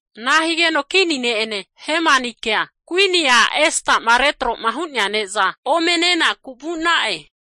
Ana higeno kini ne'ene Hemanikea kuini a' Esta'ma retro'ma hu'nea ne'za ome nenaku vu'na'e.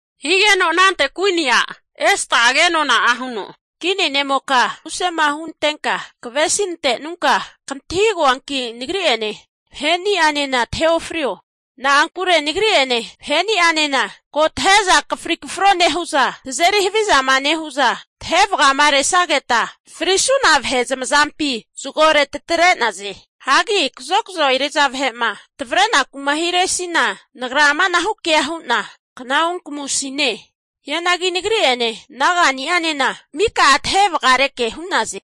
Higeno anante kuini a' Esta'a kenona'a huno, kini ne'moka musema hunantenka kavesi nantenunka, kantahigoanki nagri'ene vahe'ni'anena tahe ofrio. Na'ankure nagri'ene vahe'ni'anena ko tahe'za akafri kafro nehu'za tazeri havizama nehu'za tahe vagamaresageta frisuna vahe zamazampi zagore tatre'naze. Hagi kazokzo eri'za vahe'ma tavarenaku'ma hiresina, nagra amanahu kea hu'na kna onkamusine. Hianagi nagri'ene naga'ni'anena mika'a tahe vagareke hu'naze.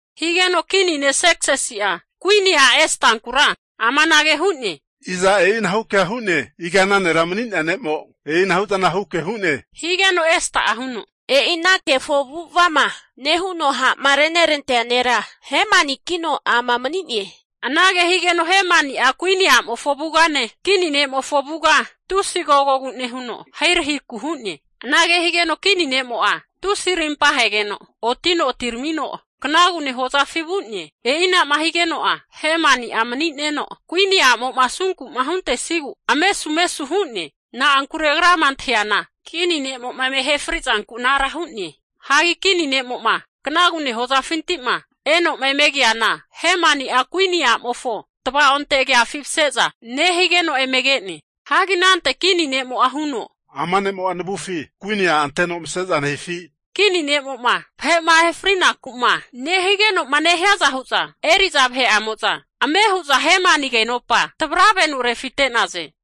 Higeno kini ne' Serksisi'a kuini a' Estankura amanage hu'ne, Iza e'inahu kea hu'ne? Iga ana nera mani'nea ne'mo e'inahu zana huke hu'ne? Higeno Esta'a kenona'a huno, E'i ana kefo avu'ava'ma nehuno ha'ma renerantea nera Hemanikino ama mani'ne. Anage higeno Hemani'a kuini a'mofo avugane, kini ne'mofo avuga tusi agogogu nehuno ahirahiku hu'ne. Anage higeno kini ne'mo'a, tusi arimpa ahegeno otino atiramino knagune hozafi vu'ne. E'inama higeno'a, Hemani'a mani'neno kuini a'mo'ma asunku'ma huntesigu amesumesu hu'ne. Na'ankure agrama antahiana, kini ne'mo'ma eme ahe frizanku anara hu'ne. Hagi kini ne'mo'ma knagune hozafinti'ma eno'ma eme keana Hemani'a kuini a'mofo tava'onte agafi mase'za nehigeno eme ke'ne. Hagi anante kini ne'mo'a huno, Ama ne'mo'a navufi kuini a' anteno vase'za nehifi? Anagema nehigeno'a, kini ne'mo'ma vahe'ma ahe frinaku'ma nehigeno'ma nehiaza hu'za eri'za vahe'amo'za ame hu'za Hemani agenopa tavravenu refite'naze.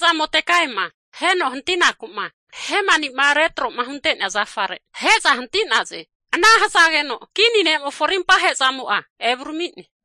Hige'za Modekaiama aheno hantinaku'ma Hemani'ma retro'ma hunte'nea zafare ahe'za hanti'naze. Ana hazageno kini ne'mofo arimpa ahe'zamo'a evurami'ne.